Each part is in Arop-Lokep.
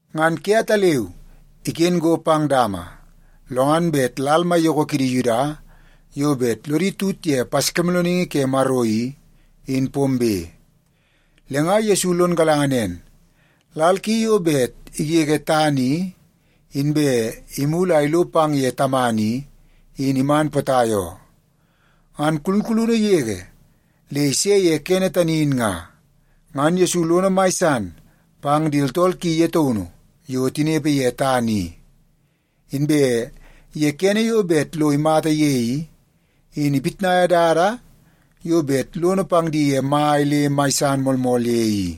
Ngan ke ataleu iken go pang dama, lo ngan bet lal maiyoko kidi Yuda yo bet lodi tut ye Paskimoolooningi ke Maro i, in pombe. Le nga Yesu lon galanga nen, lal ki yo bet igege tana i inbe imulu a ilo pang ye Tamana i, in iman potai oo. Ngan kulkulunu yege le ise ye kene tani in nga, ngan Yesu lono mai san pang di tooltool ki ye taunu yo tinepe ye tana i. Inbe ye kene yo bet lo imata ye i, in ipitnaia dada yo bet lono pang di mai le mai san moolmool ye i.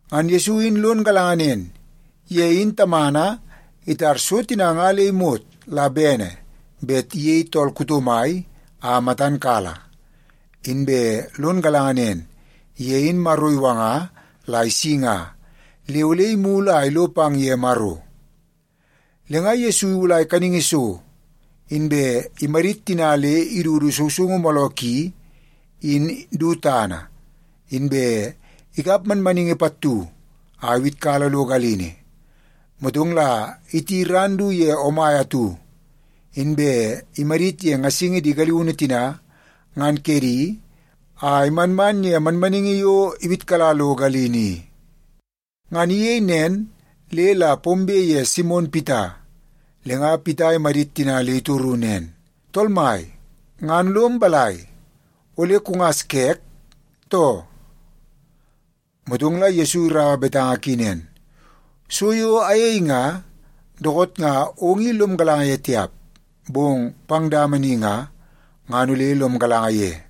Ngan Yesu in lon galanga nen, ye in Tamana itar so tina nga le imot la bene bet iyei tool kuto mai a matan kala. Inbe lon galanga nen, ye in Maro iwanga la isi nga, le ole imulu a ilo pang ye Maro. Le nga Yesu iwulai kaningi so, inbe imadit tina le idudu sousoungu mooloo ki in du tana, inbe ikap manmaningi pattu a iwitkala lo galini. Motong la iti ran du ye omai atu, inbe imadit ye ngasingi di galiunu tina ngan kedi a imanman ye manmaningi yo iwitkala lo galini i. Ngan iyei nen le la pombe ye Simon Pita, le nga Pita imadit tina le itoru nen, “Tool Mai, ngan lom balai, ole kungas kek, too?” Motong la Yesu iraua betanga ki nen, “So yo ayei nga, dookoot nga ong i lom galanga ye tiap, bong pang dama ni nga, ngan ole lom galanga ye.”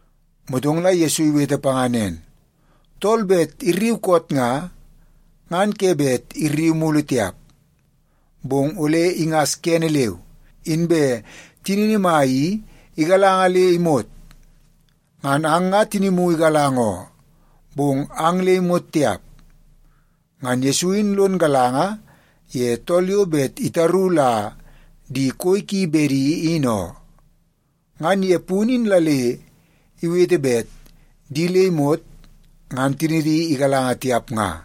Motong la Yesu iwete panga nen, “Tool bet irriu koot nga, ngan ke bet irriu mulu tiap, bong ole ingas kene leu, inbe tinini mai i igalanga le imot. Ngan ang nga tinimu igalanga oo, bong ang nga le imot tiap.” Ngan Yesu in lon galanga ye tool yo bet itaru la di koi ki bedi in oo. Ngan ye punu in la le iwete bet di le imot ngan tinidi igalanga tiap nga.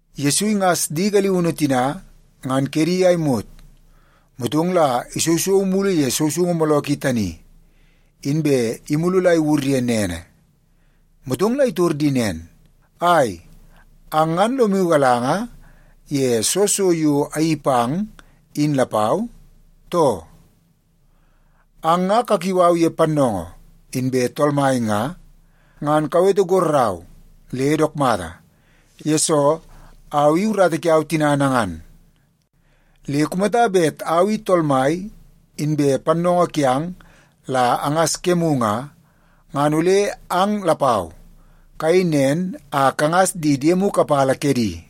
Yesu ingas di galiunu tina ngan kedi a imot, motong la isousou mulu ye sousoungu mooloo ki tani, inbe imulu la iwur ye nene. Motong la itor di nen, “Ai, ang nga lomu galanga ye soo so yo ayeii pang in lapau, too? Ang nga kakiu au ye ‘Pannoongoo’ inbe ‘Tool Mai’ nga, ngan kawete gorrau le dook mata, yesoo au i urata kiau tina nangan. Le kumata bet au i Tool Mai inbe Pannoongoo kiang la angas kemu nga, ngan ole ang lapau, kayei nen a kangas di diemu kapala kedi.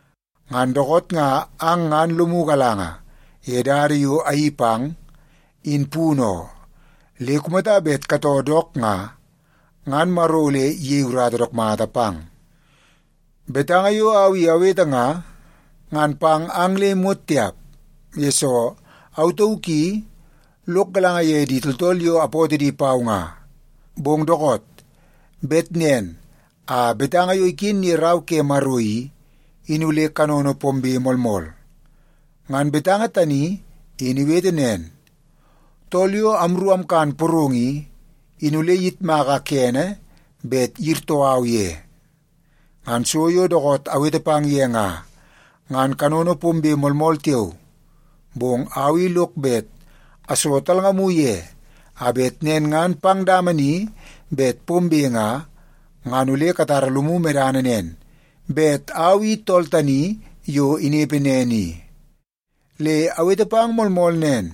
Ngan dookoot nga ang ngan lomu galanga ye dada yo ayeii pang, in punu oo. Le kumata bet katoo dook nga, ngan Maro ole iyei urata dook mata pang. “Betanga yo au i awete nga, ngan pang ang le imot tiap, yesoo au tauk i lok galanga ye di tooltool yo apootoo di pau nga. Bong dookoot bet nen a betanga yo iken ye Rau ke Maro i, in ole kanono pombe moolmool. Ngan betanga tani in iwete nen, ‘Tool yo amru amkan porong i, in ole iyitmaka kene bet iyirtoo au ye.’ “Ngan so yo dookoot awete pang ye nga, ngan kanono pombe moolmool tiao. Bong au i lok bet aso talngamu ye, a bet nen ngan pang dama ni bet pombe nga, ngan ole katara lomu medana nen bet Au I Tool Tani Yo Inepe Nen I. Le awete pang moolmool nen,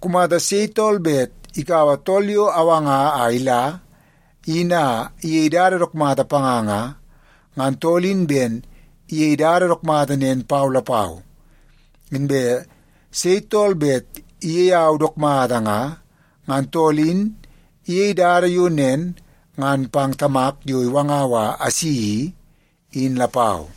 kumata sei tool bet ikaua tool yo awanga a ila, in a iyei dada dook mata panga nga, ngan tool in ben iyei dada dook mata nen pau lapau. Inbe sei tool bet iyei au dook mata nga, ngan tool in iyei dada yo nen ngan pang Tamak yo iwangau a asi i, in lapau.”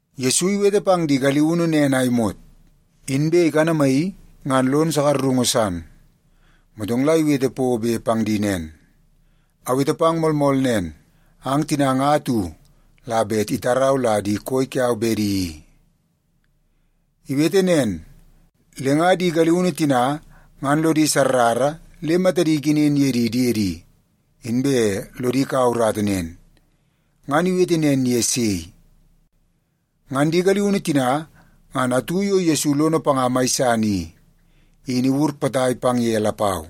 Yesu iwete pang di galiunu nen a imot, inbe ikanamaii ngan lon sakarungu san. Motong la iwete pobe pang di nen, “Awete pang moolmool nen, ang tina nga atu la bet itarau la di koi kiau bedi i.” Iwete nen, le nga di galiunu tina ngan lodi sarrara le matadi ikenen ye di diedi, inbe lodi kaua urata nen, ngan iwete nen ye sei. Ngan di galiunu tina ngan atu yo Yesu lono panga mai san i, in iwur potai pang ye lapau.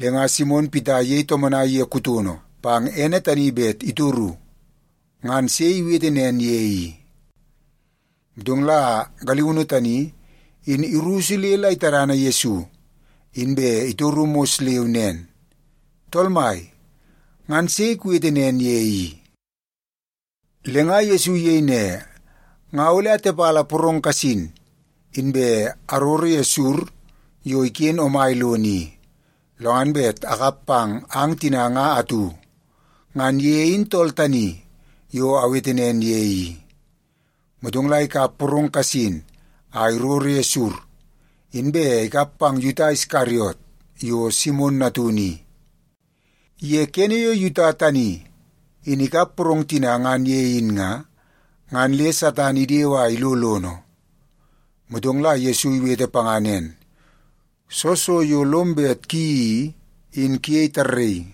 Le nga Simon Pita iyei tomonai ye kutono pang ene tani bet itoru, ngan sei iwete nen ye i. Motong la galiunu tani, in irusu le la itadana Yesu, inbe itoru mos leu nen, “Tool Mai, ngan sei kuwete nen ye i?” Le nga Yesu iyei ne, “Nga ole atepala porong kasin, inbe aroro ye sur yo iken omai lono i, lo ngan bet akap pang ang tina nga atu. Ngan ye in tool tani yo awete nen ye i.” Motong la ikap porong kasin a iroro ye sur, inbe ikap pang Yuta Iskariot yo Simon natunu i. Ye kene yo Yuta tani in ikap porong tina ngan ye in nga, ngan le Satan idewe a ilo lono. Motong la Yesu iwete panga nen, “Soo so yo lom bet kuyeii i, in kuyei tarraii.”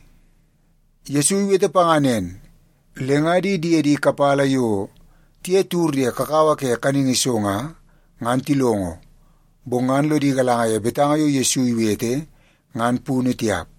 Yesu iwete panga nen, le nga di diede kapala yo tiye tiwur ye kakawa ke kaningi so nga, ngan tilongo, bong ngan lodi galanga ye betanga yo Yesu iwete ngan punu tiap.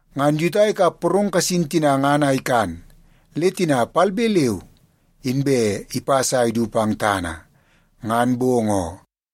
Ngan Yuta ikap porong kasin tina ngan a ikan, le tina palbe leu inbe ipas a idu pang tana. Ngan bong oo.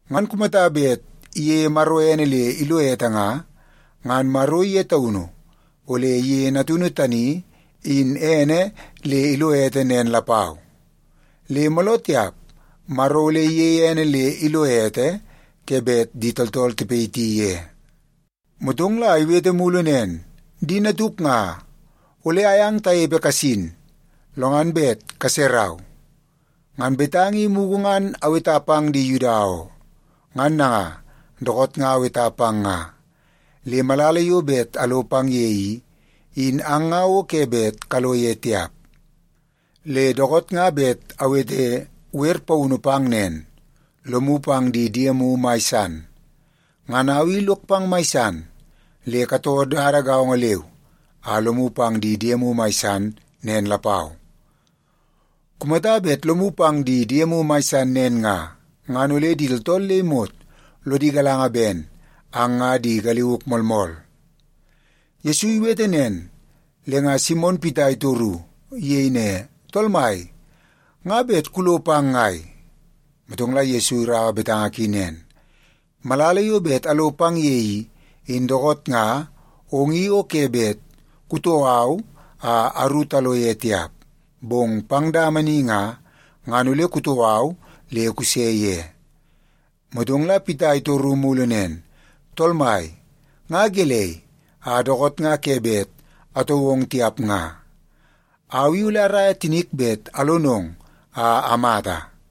Ngan kumata bet iyeie Maro ene le ilo ete nga, ngan Maro ye taunu ole iyeie Natunu tani in ene le ilo ete nen lapau. Le mooloo tiap Maro ole iyeie ene le ilo ete ke bet di tooltool tipayiti ye.” Motong la iwete mulu nen, “Di natuk nga, ole ayang tanepe kasin, lo ngan bet kaserau. Ngan betanga i mugu ngan aweta pang di Yuda oo, ngan nanga dookoot nga aweta pang nga. Le malala yo bet alo pang ye i, in ang nga o ke bet kalo ye tiap. Le dookoot nga bet awete wer paunu pang nen: Lomu pang di diemu mai san. Ngan au i lok pang mai san, le katoo dada gaongo leu a lomu pang di diemu mai san nen lapau. Kumata bet lomu pang di diemu mai san nen nga, ngan ole di tooltool le imot lodi galanga ben ang nga di galiuk moolmool.” Yesu iwete nen, le nga Simon Pita itoru. Iyei ne, “Tool Mai, nga bet kulo pang ngai?” Motong la Yesu iraua betanga ki nen, “Malala yo bet alo pang ye i, in dookoot nga ong i o ke bet kutoo au a aru talo ye tiap. Bong pang dama ni nga, ngan ole kutoo au le kuse ye.” Motong la Pita itoru mulu nen, “Tool Mai, nga gelei a dookoot nga ke bet atoo ong tiap nga? Au i ole araia tinik bet alonong a amata.”